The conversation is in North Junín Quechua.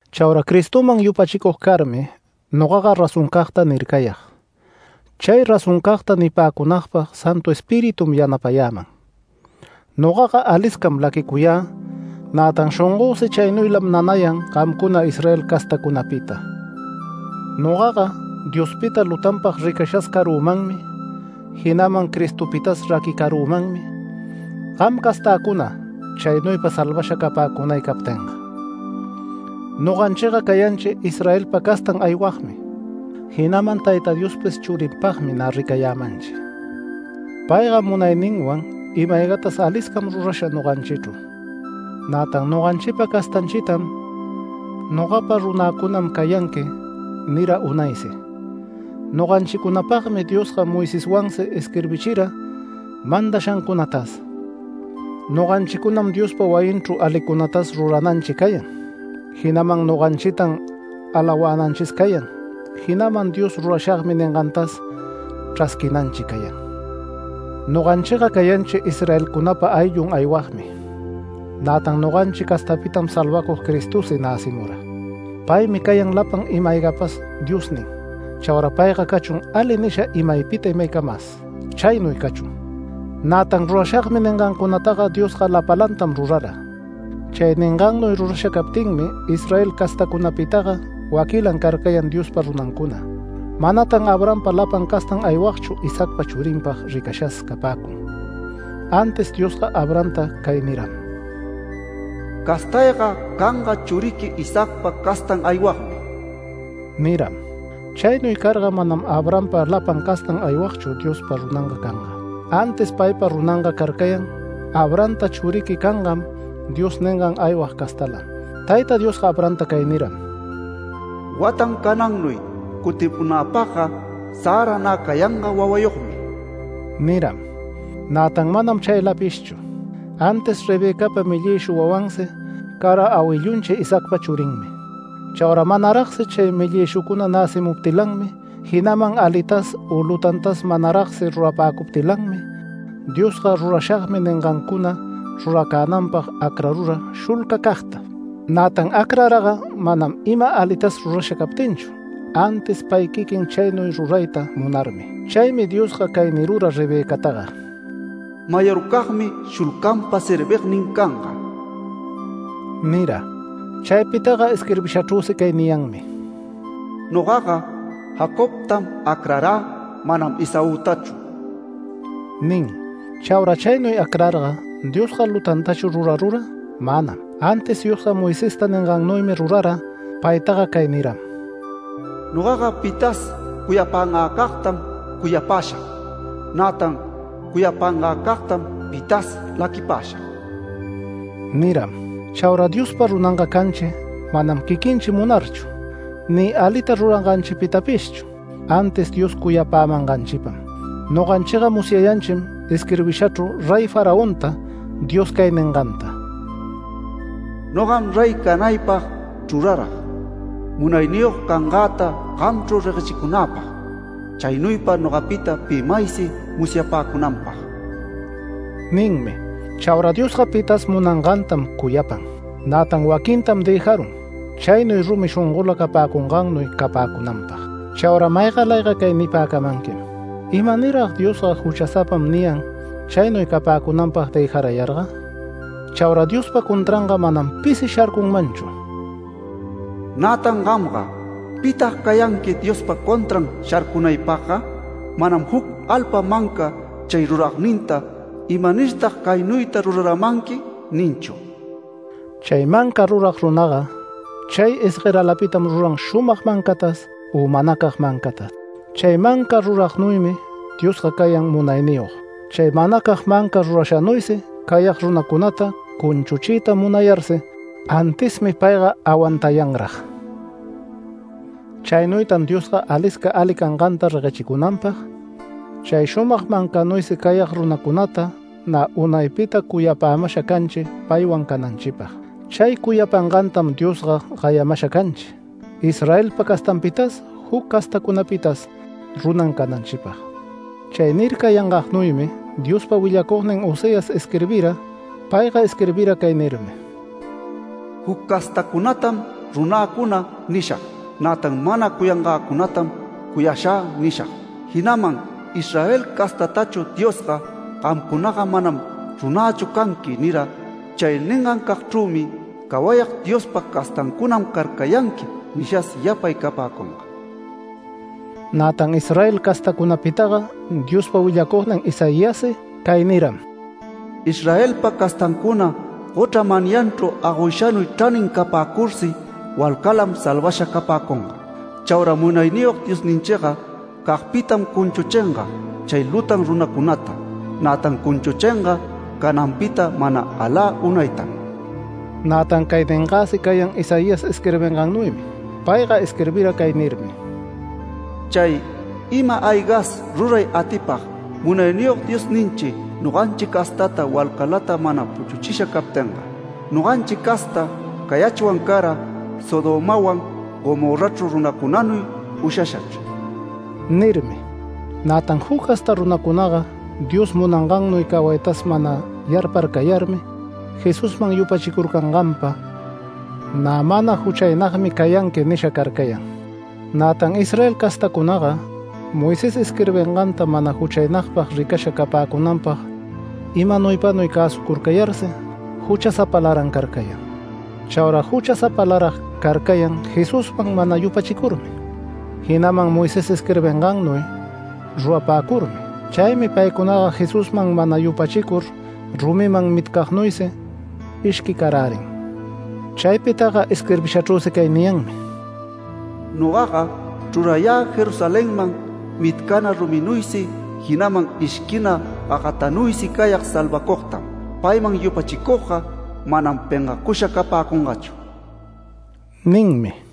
Chaura Cristoman yupachicug carmi, nogaga razoncagta nircayag, chay razoncagta nipäcunagpag Santu Espiritum yanapayäman. Nogaga aliscam laquicuyä, nätan shongösi chaynuylam nanayan gamcuna Israel castäcunapita. Nogaga Diospita lutanpag ricashas carümanmi, jinaman Cristopitas raquicarümanmi gam castäcuna chaynuypa salvasha capäcunay captinga. Noganchiga cayanchi Israelpa castan aywagmi, jinaman Tayta Diospis churinpagmi nä ricayämanchi. Payga munayninwan ima-aygatas aliscam rurasha noganchichru, nätan noganchipa castanchitam “Nogapa runäcunam cayanqui” nira unaysi. Noganchicunapagmi Diosga Moiseswansi isquirbichira mandashancunatas. Noganchicunam Diospa wayinchru alicunatas rurananchi cayan, jinaman noganchitan alawänanchis cayan, jinaman Dios “Rurashagmi” ningantas chrasquinanchi cayan. Noganchiga cayanchi Israelcunapa ayllun aywagmi. Nätan noganchi castapitam salvacug Cristosi näcimura. Paymi cayan lapan ima-aygapas Diosnin. Chaura payga cachun ali nisha imaypita imaycamas. Chaynuy cachun. Nätan “Rurashagmi” ningancunata Diosga lapalantam rurara. Chay ningannuy rurasha captinmi Israel castacunapitaga waquilan carcayan Diospa runancuna. Manatan Abrahampa lapan castan aywagchu Isaacpa churinpag ricashas capäcun. Antis Diosga Abrahamta cay niram: “Castayga canga churiqui Isaacpa castan aywagmi” niram. Chaynuy carga manam Abrahampa lapan castan aywagchu Diospa runanga canga, antis paypa runanga carcayan “Abrahamta churiqui cangam” Dios ningan aywag castalam. Tayta Diosga Abrahamta cay niram: “Watan canannuy cutimunäpagga Sara nä cayanga wawayogmi” niram. Nätan manam chaylapishchu, antis Rebecapa mellïshu wawansi cara awillunchi Isaacpa churinmi. Chaura manaragsi chay mellïshucuna näcimuptilanmi, jinaman alitas u lutantas manaragsi rurapäcuptilanmi Diosga “Rurashagmi” ningancuna ruracänanpag acrarura shulcacagta. Nätan acraraga manam ima alitas rurasha captinchu, antis pay quiquin chaynuy rurayta munarmi. Chaymi Diosga cay nirura Rebecataga: “Mayorcagmi shulcanpa servignin canga” nira. Chaypitaga isquirbishachrüsi cay niyanmi: “Nogaga Jacobtam acrarä, manam Esaütachu” nin. Chaura chaynuy acrarga ¿Diosga lutantachu rurarura? Manam. Antis Diosga Moisesta ningannuymi rurara. Paytaga cay niram: “Nogaga pitas cuyapangäcagtam cuyapäshag. Nätan cuyapangäcagtam pitas laquipäshag” niram. Chaura Diospa runanga canchi manam quiquinchi munarchu, ni alita ruranganchipitapishchu, antis Dios cuyapämanganchipam. Noganchiga musyayanchim isquirbishachru, Rey Faraonta Dios cay ninganta: “Nogam rey canaypag chrurarag, munayniyog cangäta gamchru reguechicunäpag, chaynuypa nogapita pi maysi musyapäcunanpag” ninmi. Chaura Diosga, pitas munangantam cuyapan, nätan waquintam dëjarun chaynuy rumi shongola capäcungannuy capäcunanpag. Chaura maygalayga cay nipäcamanquim: “¿Imanir-rag Diosga ‘Juchasapam’ niyan chaynuy capäcunanpag dëjarayarga?” Chaura Diospa contranga manam pisi sharcunmanchu. Nätan gamga ¿pitag cayanqui Diospa contran sharcunaypagga? Manam juc alpa manca chay ruragninta “¿Imanirtag caynuyta ruraramanqui?” ninchu. Chay manca rurag runaga chay isgueralapitam ruran shumag mancatas u manacag mancatas. Chay manca ruragnuymi Diosga cayan munayniyog. Chay manacag manca rurashanuysi cayag runacunata cunchuchiyta munayarsi, antismi payga awantayanran. Chaynuytam Diosga alisca ali canganta reguechicunanpag chay shumag mancanuysi cayag runacunata nä unaypita cuyapämasha canchi paywan cananchipag. Chay cuyapangantam Diosga gayamasha canchi, Israelpa castanpitas, juc castacunapitas runan cananchipag. Chay nircayangagnuymi Diospa willacugnin Oseas isquirbira. Payga isquirbira cay nirmi: “Juc castacunatam runäcuna” nishag. Nätan “Mana cuyangäcunatam cuyashä” nishag. Jinaman “Israel castatachu Diosga ‘Gamcunaga manam runächu canqui’ nira. Chay ningancagchrümi ‘Cawayag Diospa castancunam carcayanqui’ nishas yapay capäcunga”. Nätan Israel castacunapitaga Diospa willacugnin Isaiassi cay niram: “Israelpa castancuna gochra manyanchru agoyshanuy chranin capäcursi walcalam salvasha capäcunga. Chaura Munayniyog Diosninchiga cagpitam cunchuchinga chay lutan runacunata, nätan cunchuchinga cananpita mana alä unaytam”. Nätan cay ningäsi cayan Isaías isquirbingannuymi. Payga isquirbira cay nirmi: “Chay ima-aygas ruray atipag, Munayniyog Diosninchi noganchi castata walcalata mana puchuchisha captinga. Noganchi casta cayachwan cara Sodomawan Gomorrachru runacunanuy ushashachr” nirmi. Nätan juc casta runacunaga Dios munangannuy cawaytas mana yarparcayarmi Jesusman yupachicurcanganpa, “Nä mana juchaynagmi cayanqui” nisha carcayan. Nätan Israel castacunaga Moisés isquirbinganta mana juchaynagpag ricasha capäcunanpag imanuypanuy cäsucurcayarsi, juchasapalaran carcayan. Chaura juchasapalarag carcayan Jesusman mana yupachicurmi, jinaman Moisés isquirbingannuy rurapäcurmi. Chaymi paycunaga Jesusman mana yupachicur rumiman mitcagnuysi ishquicarärin. Chaypitaga isquirbishachrüsi cay niyanmi: “Nogaga chrurayä Jerusalenman mitcana ruminuysi, jinaman ishquina gagatanuysi cayag salvacugtam. Payman yupachicugga, manam pengacusha capäcungachu” ninmi.